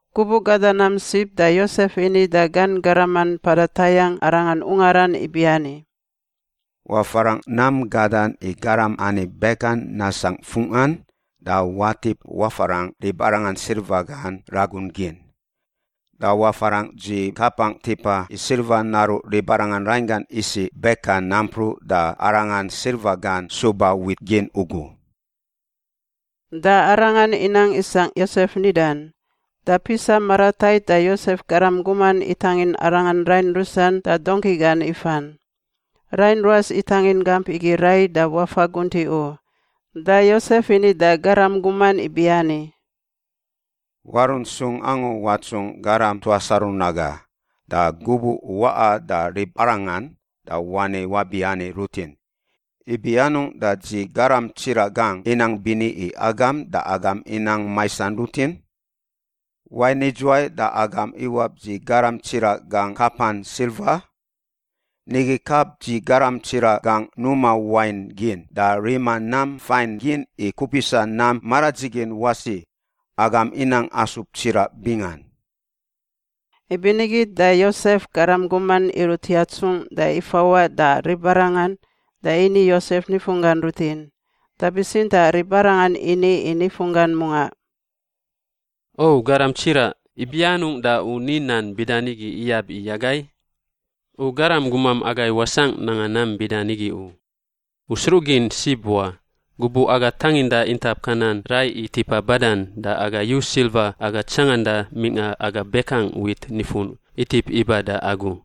Gubuꞌ gada nam sib da Yosef ini da gan garaman mpada tayangꞌ arangan ungaran ibiani, “Wafarangꞌ nam gadan i garam ani bekan nasangꞌ fungꞌan da watip wafarangꞌ ribarangan silva gan ragun gin. Da wafarangꞌ dzi kapangꞌ tipa i silva naruꞌ ribarangan rainggan isiꞌ bekan nampruꞌ da arangan silva gan suba wit gin ugu.” Da arangan inang isangꞌ Yosef nidan. Da pisa maratait da Yosef garam guman itangin arangan rain rusan da dongki gan ifan. Rain ruas itangin gamp igi rai da wafa guntiꞌ u da Yosef ini da garam guman ibiani, “Warunt sung angu watsungꞌ garam tuas aru naga. Da gubuꞌ u waꞌa da ribarangan da wani wabiani rutin, ‘Ibi anungꞌ da dzi garam tsiraꞌ gangꞌ inang bini i agam da agam inang maisan rutin? Wain idzuwai da agam iwap dzi garam tsiraꞌ gangꞌ kapan silva? Nigi kap dzi garam tsiraꞌ gangꞌ numa wain gin da rima nam fain gin i kupisa nam maradzigin wasi. Agam inang asub tsiraꞌ bingan.’” Ibinigi da Yosef garam guman irunt yatsungꞌ da ifawaꞌ da ribarangan da ini Yosef nifunggan rutin. Da bitsintaꞌ ribarangan ini i nifunggan mungaꞌ, “O garam tsiraꞌ, ibi anungꞌ da u ni nan bida nigi iyab i agai? U garam gumam agai wasangꞌ nanga nam bida nigi u. U sruꞌgin sib wa, gubuꞌ aga tanginda intap Kanan rai i tipa badan, da aga yu silva aga tsanganda mingꞌa aga bekangꞌ wit nifun itip iba da agu.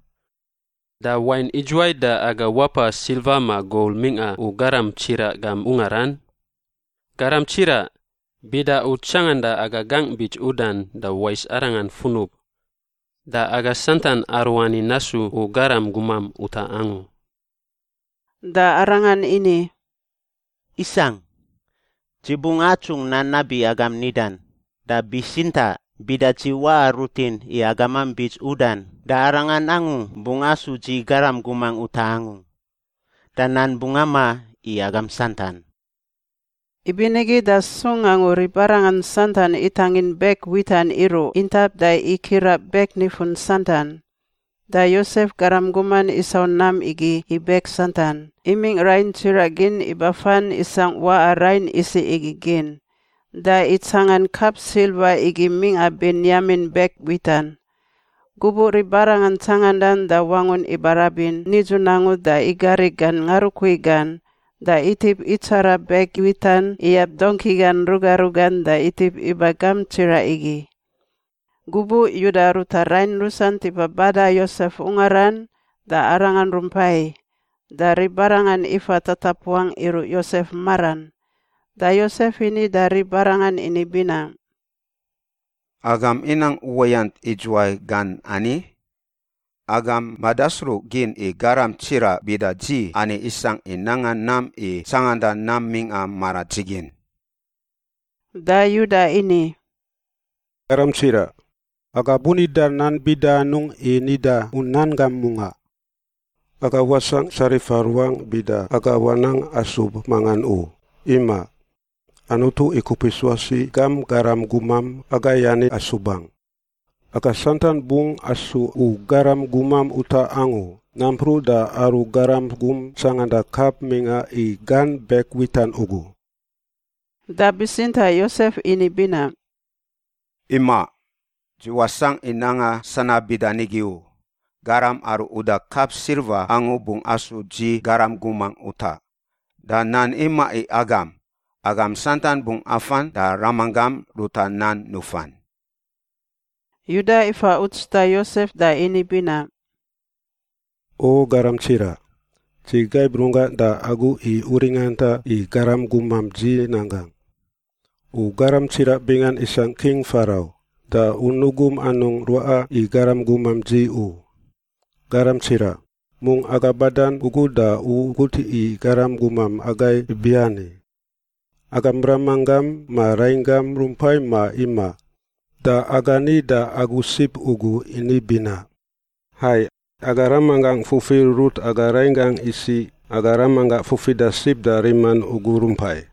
Da wain idzuwai da aga wapa silva ma gol mingꞌa u garam tsiraꞌ gam ungaran? Garam tsiraꞌ! Bida u tsanganda aga gangꞌ bits udan, da wais arangan funub. Da aga santan aruani nasu u garam gumam utaꞌ angu.” Da arangan ini, “Isangꞌ. Dzi bungꞌ atsungꞌ nan nabi agam nidan, da bitsintaꞌ bida dzi waꞌa rutin i agamam bits udan da arangan angu bungꞌ asu dzi garam gumangꞌ utaꞌ angu. Da nan bungꞌ amaꞌ i agam santan.” Ibinigi da sung angu ribarangan santan itangin bek witan iruꞌ intap da ikiraꞌ bek nifun santan. Da Yosef garam guman isau nam igi i bek santan, imingꞌ rain tsiraꞌ gin ibafan isangꞌ waꞌa rain isiꞌ igi gin. Da itsangan kap silva igi mingꞌa Benyamin bek witan. Gubuꞌ ribarangan tsangandan da wangun ibarabin nidzun angu da igari gan ngarukui gan, da itip itsara bek witan iyab dongki gan ruga rugan da itip iba gamp tsiraꞌ igi. Gubuꞌ Yuda ruta rain rusan tipa bada Yosef ungaran da arangan rumpai. Da ribarangan ifa tatapuangꞌ iruꞌ Yosef maran. Da Yosef ini da ribarangan ini binaꞌ, “Agam inang uwayant idzuwai gan ani? Agam madasruꞌgin i garam tsiraꞌ bida dzi ani isangꞌ i nanga nam i tsanganda nam mingꞌa maradzigin.” Da Yuda ini, “Garam tsiraꞌ. Aga bunida nan bida anungꞌ i nida u nan gam mungaꞌ? Aga wasangꞌ tsarifa ruangꞌ bida aga wanang asub mangan u, imaꞌ. Anutu ikupis wasi gam garam gumam agai ani asubangꞌ. Aga santan bungꞌ asu u garam gumam utaꞌ angu nampruꞌ da aru garam gum tsanganda kap mingꞌa i gan bek witan ugu.” Da bitsintaꞌ Yosef ini binaꞌ, “Imaꞌ. Dzi wasangꞌ i nanga sanab bida nigi u. Garam aru uda kap silva angu bungꞌ asu dzi garam gumangꞌ utaꞌ. Da nan imaꞌ i agam. Agam santan bungꞌ afan da ramanggam ruta nan nufan.” Yuda ifa uts da Yosef da ini binaꞌ, “O garam tsiraꞌ! Dzi gaib runggangꞌ da agu i u ringanta i garam gumam dzi nan gangꞌ. U garam tsiraꞌ bingan isangꞌ King Farau, da u nugum anungꞌ ruaꞌa i garam gumam dzi u. Garam tsiraꞌ, mungꞌ aga badan ugu da u gut i garam gumam agai ibiani, ‘Agam ramanggam ma rainggam rumpai ma imaꞌ?’ Da aga ni da agu sib ugu ini binaꞌ, ‘Hai, aga ramanggangꞌ fufi rurut aga rainggangꞌ isiꞌ aga ramanggangꞌ fufida sib da riman ugu rumpai.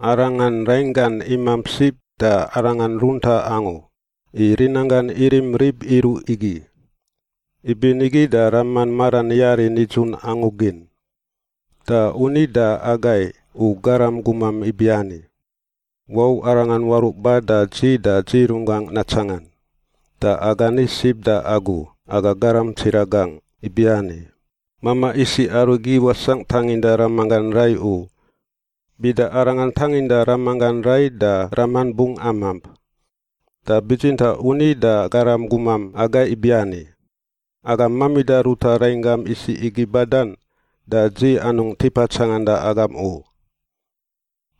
Arangan rainggan imamp sib, da arangan runtaꞌ angu, i rinanggan irim rib iruꞌ igi. Ibinigi da raman maran yari nidzun angu gin.’ Da u ni da agai u garam gumam ibiani, ‘Wau arangan waruꞌ ba da dzi da dzi runggangꞌ natsangan.’ Da aga ni sib da agu, aga garam tsiraꞌ gangꞌ, ibiani, ‘Mamaꞌ isiꞌ arigi wasangꞌ i tanginda ramanggan rai u. Bida arangan tanginda ramanggan rai da raman bungꞌ amamp.’ Da bitsintaꞌ u ni da garam gumam agai ibiani, ‘Agam mamida ruta rainggam isiꞌ igi badan da dzi anungꞌ tipa tsanganda agam u.’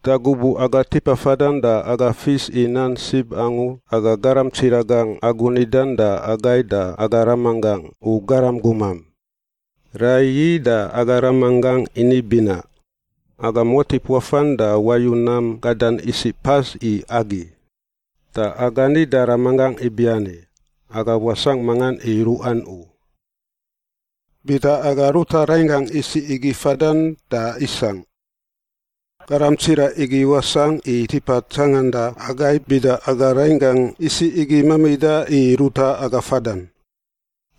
“Da gubuꞌ aga tipa fadan da aga fis i nan sib angu aga garam tsiraꞌ gangꞌ agu nidan da agai da aga ramanggangꞌ, u garam gumam. Raiyi da aga ramanggangꞌ ini binaꞌ, ‘Agam watip wafan da wayu nam gadan isiꞌ pas i agi.’ Da aga ni da ramanggangꞌ ibiani, ‘Aga wasangꞌ mangan i ruꞌan u. Bida aga ruta rainggangꞌ isiꞌ igi fadan, da isangꞌ. Garam tsiraꞌ igi wasangꞌ i tipa tsanganda agai bida aga rainggangꞌ isiꞌ igi mamida i ruta aga fadan.’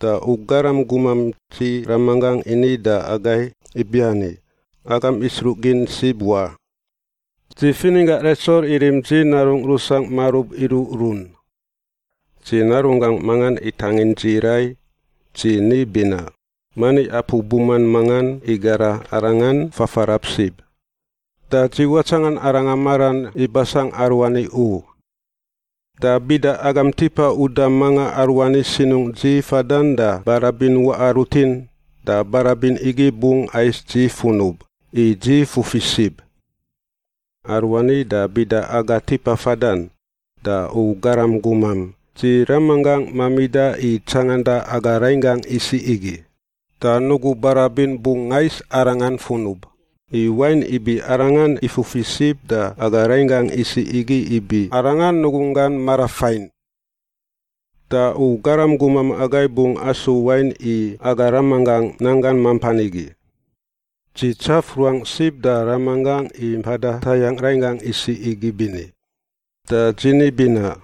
Da u garam gumam dzi ramanggangꞌ ini da agai ibiani, ‘Agam isruꞌgin sib wa. Dzi fininggangꞌ Retsel irim dzi narungꞌ rusangꞌ marub iruꞌrun. Dzi narunggangꞌ mangan itangin dzi rai. Dzi ni binaꞌ, “Mani apu buman mangan igara arangan fafarab sib.” Da dzi watsangan arangan maran ibasangꞌ aruani u. Da bida agam tipa uda manga aruani sinungꞌ dzi fadan da barabin waꞌa rutin, da barabin igi bungꞌ ais dzi funub, i dzi fufi sib.’ “Aruani da bida aga tipa fadan, da u garam gumam dzi ramanggangꞌ mamida i tsanganda aga rainggangꞌ isiꞌ igi, da nugu barabin bungꞌ ais arangan funub, i wain ibi arangan ifufi sib da aga rainggangꞌ isiꞌ igi ibi arangan nugunggan marafain. Da u garam gumam agai bungꞌ asu wain i aga ramanggangꞌ nanggan mampan igi. Dzi tsaf ruangꞌ sib da ramanggangꞌ i mpada tayangꞌ rainggangꞌ isiꞌ igi bini. Da dzi ni binaꞌ,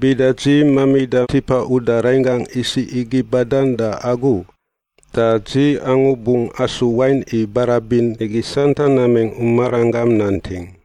‘Bida dzi mamida tipa uda rainggangꞌ isiꞌ igi badan da agu, da dzi angu bungꞌ asu wain i barabin igi santan namingꞌ u maranggam nanting.’